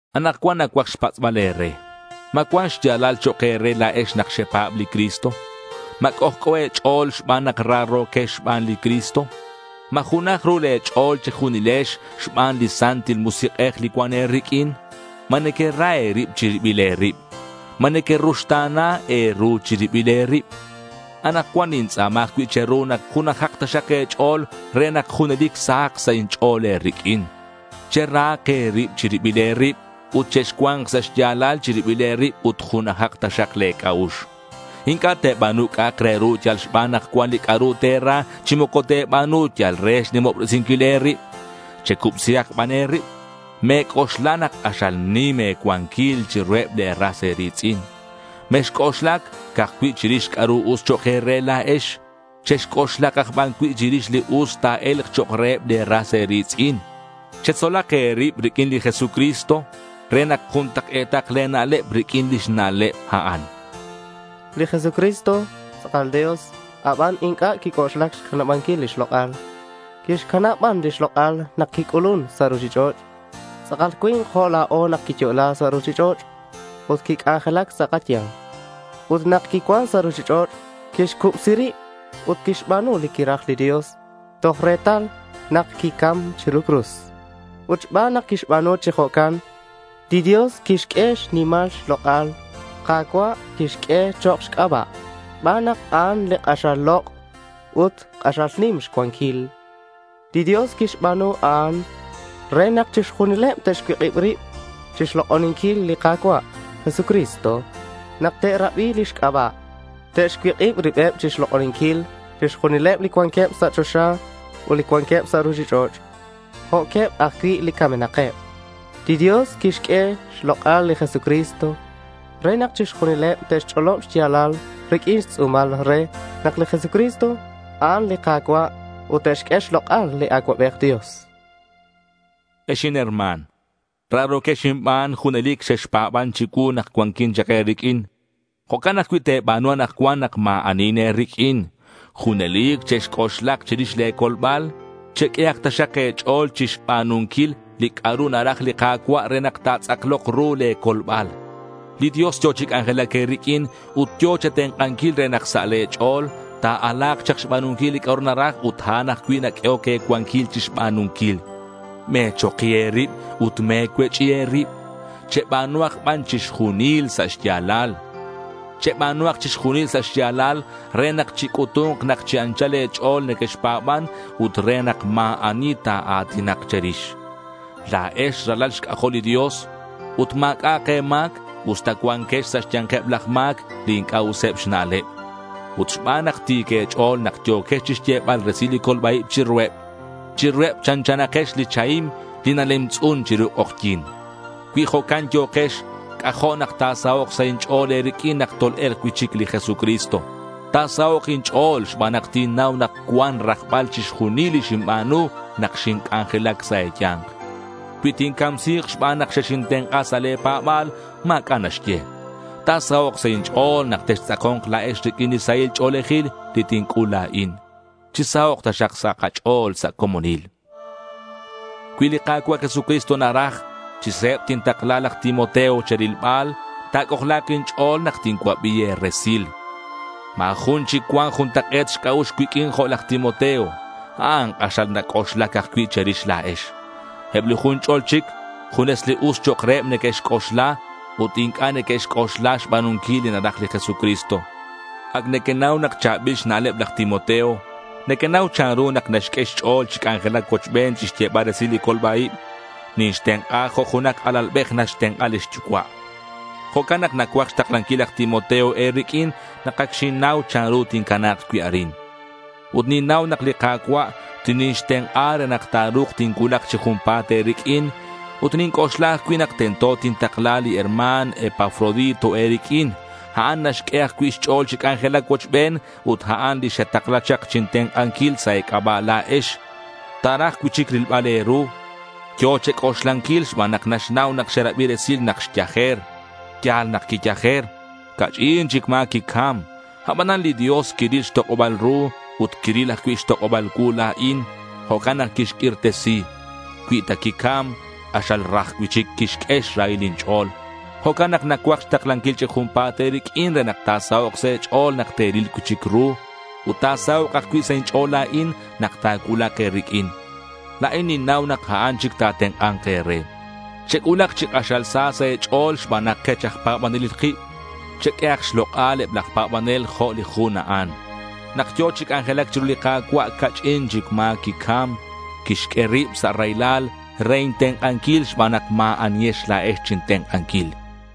Anakcuan nacuaj xpatz'bal e̱re: ¿Ma cuan xya̱lal chok' e̱re la̱ex nak xepa̱b li Cristo? ¿Ma c'ojc'o e̱ch'o̱l xban nak raro̱quex xban li Cristo? ¿Ma junaj ru le̱ ch'o̱l che̱junilex xban li Santil Musik'ej li cuan e̱riq'uin? ¿Ma nequera e̱rib chi ribil e̱rib? ¿Ma nequeruxta̱na e̱ru chi ribil e̱rib? Anakcuan nintz'a̱ma ajcui' che̱ru nak junajak taxak e̱ch'o̱l re nak junelic sahak sa' inch'o̱l e̱riq'uin. Cherahak e̱rib chi ribil e̱rib ut chexcua̱nk sa' xya̱lal chi ribil e̱rib ut junajak taxak le̱ c'a'ux. Inc'a' te̱ba̱nu c'a'ak re ru yal xban nak cuan li c'a'ru te̱ra, chi moco te̱ba̱nu yal re xnimobresinquil e̱rib. Checubsihak ban e̱rib. Me̱c'oxla nak k'axal nim e̱cuanquil chiruheb le̱ ras e̱ri̱tz'in. Mexc'oxlac ca'aj cui' chirix c'a'ru us chok' e̱re la̱ex. Chexc'oxlak aj ban cui' chirix li us ta̱e̱lk chok' reheb le̱ ras e̱ri̱tz'in. Chetzolak e̱rib riq'uin li Jesucristo re nak juntak'e̱tak le̱ na'leb riq'uin lix na'leb a'an. Li Jesucristo tz'akal Dios, aban inc'a' quic'oxlac xcanabanquil lix lok'al. Quixcanab ban lix lok'al nak quic'ulun sa' ruchich'och'. Tz'akal cui̱nk jo' la̱o nak quiyo'la sa' ruchich'och' ut quic'anjelac sa' kaya̱nk. Ut nak quicuan sa' ruchich'och' quixcubsi rib ut quixba̱nu li quiraj li Dios toj retal nak quicam chiru li cruz. Ut xban nak quixba̱nu chi jo'can, li Dios quixq'ue xnimal xlok'al. “Ka̱cua'” quixq'ue chok' xc'aba' xban nak a'an li k'axal lok' ut li k'axal nim xcuanquil. Li Dios quixba̱nu a'an re nak chixjunileb te'xcuik'ib rib chixlok'oninquil li Ka̱cua' Jesucristo nak te'rabi lix c'aba'. Te'xcuik'ib ribeb chixlok'oninquil chixjunileb li cuanqueb sa' choxa ut li cuanqueb sa' ruchich'och' jo'queb ajcui' li camenakeb. Li Dios quixq'ue xlok'al li Jesucristo re nak chixjunileb te'xch'olob xya̱lal riq'uin xtz'u̱mal re nak li Jesucristo, a'an li Ka̱cua' ut te'xq'ue xlok'al li Acuabej Dios. Ex inherma̱n, raro̱quex inban, junelic xexpa̱ban chicuu nak cuanquin chak e̱riq'uin. Jo'can ajcui' te̱ba̱nu anakcuan nak ma̱ anihin e̱riq'uin. Junelic chexc'oxlak chirix le̱ colbal. Cheq'uehak taxak e̱ch'o̱l chixba̱nunquil li c'a'ru naraj li Ka̱cua' re nak ta̱tz'aklok ru le̱ colbal. Li Dios yo̱ chi c'anjelac e̱riq'uin ut yo̱ che̱tenk'anquil re nak sa' le̱ ch'o̱l ta̱ala̱k chak xba̱nunquil li c'a'ru naraj ut a'an ajcui' naq'uehoc e̱cuanquil chixba̱nunquil. Me̱choki e̱rib ut me̱cuech'i e̱rib. Cheba̱nuhak ban chixjunil sa' xya̱lal. Cheba̱nuhak chixjunil sa' xya̱lal re nak chic'utu̱nk nak chi anchal e̱ch'o̱l nequexpa̱ban ut re nak ma̱ ani ta̱a̱tinak che̱rix. La̱ex ralal xc'ajol li Dios ut ma̱c'a'ak e̱ma̱c usta cuanquex sa' xya̱nkeb laj ma̱c, li inc'a' useb xna'leb. Ut xban nak ti̱c e̱ch'o̱l, nak yo̱kex chixyebal resil li colba-ib chiruheb, chiruheb chanchanakex li chahim li nalemtz'un chiru k'ojyi̱n. Cui jo'can yo̱kex, c'ajo' nak ta̱sahok' sa' inch'o̱l e̱riq'uin nak tol-e̱lk cui'chic li Jesucristo. Ta̱sahok' inch'o̱l xban nak tinnau nak cuan rajbal chixjunil li xinba̱nu nak xinc'anjelac sa' e̱ya̱nk. Cui tincamsi̱k xban nak xexintenk'a sa' le̱ pa̱ba̱l, ma̱c'a' naxye. Ta̱sahok' sa' inch'o̱l nak textz'ako̱nk la̱ex riq'uin li sahil ch'o̱lejil li tinc'ul la̱in. Chisahok' taxak sa' kach'o̱l sa' comonil. Cui li Ka̱cua' Jesucristo naraj, chi se̱b tintakla laj Timoteo che̱rilbal. Ta̱c'ojla̱k inch'o̱l nak tincuabi e̱resil. Ma̱ jun chic cuan juntak'e̱t xc'a'ux cuiq'uin jo' laj Timoteo. A'an k'axal nac'oxlac ajcui' che̱rix la̱ex. Eb li jun ch'ol chic junes li us chok' reheb a'an neque'xc'oxla ut inc'a' neque'xc'oxla xba̱nunquil li naraj li Jesucristo. Ac nequenau nak cha̱bil xna'leb laj Timoteo. Nequenau chanru nak naxq'ue xch'o̱l chi c'anjelac cuochben chixyebal resil li colba-ib. Ninxtenk'a jo' junak alalbej naxtenk'a lix yucua'. Jo'can nak nacuaj xtaklanquil laj Timoteo e̱riq'uin nak ac xinnau chanru tincana̱k cui' arin. Ut ninnau nak li Ka̱cua' tinixtenk'a re nak ta̱ru̱k tincuulak chi junpa̱t e̱riq'uin. Ut ninc'oxla ajcui' nak tento tintakla li herma̱n Epafrodito e̱riq'uin. A'an naxq'ue ajcui' xch'o̱l chi c'anjelac cuochben ut a'an li xetakla chak chintenk'anquil sa' e̱c'aba' la̱ex. Ta̱raj cui'chic rilbal e̱ru. Yo̱ che̱c'oxlanquil xban nak naxnau nak xerabi resil nak xyajer. Ya̱l nak quiyajer. Ca'ch'in chic ma̱ quicam. Abanan li Dios quiril xtok'oba̱l ru ut quiril ajcui' xtok'oba̱l cuu la̱in. Jo'can nak quixq'uirtesi. Cui ta quicam, k'axal raj cui'chic quixq'ue xrahil inch'o̱l. Jo'can nak nacuaj xtaklanquil chi junpa̱t e̱riq'uin re nak ta̱sahok' sa' e̱ch'o̱l nak te̱ril cui'chic ru. Ut ta̱sahok' ajcui' sa' inch'o̱l la̱in nak ta̱cuulak e̱riq'uin. La̱in ninnau nak a'an chic ta̱tenk'a̱nk e̱re. Chec'ulak chi k'axal sa sa' e̱ch'o̱l xban nak kech aj pa̱banelil kib. Cheq'uehak xlok'al eb laj pa̱banel jo' li jun a'an. Nak yo̱ chi c'anjelac chiru li Ka̱cua', ca'ch'in chic ma̱ quicam. Quixq'ue rib sa' raylal re intenk'anquil xban nak ma̱ anihex la̱ex chintenk'anquil.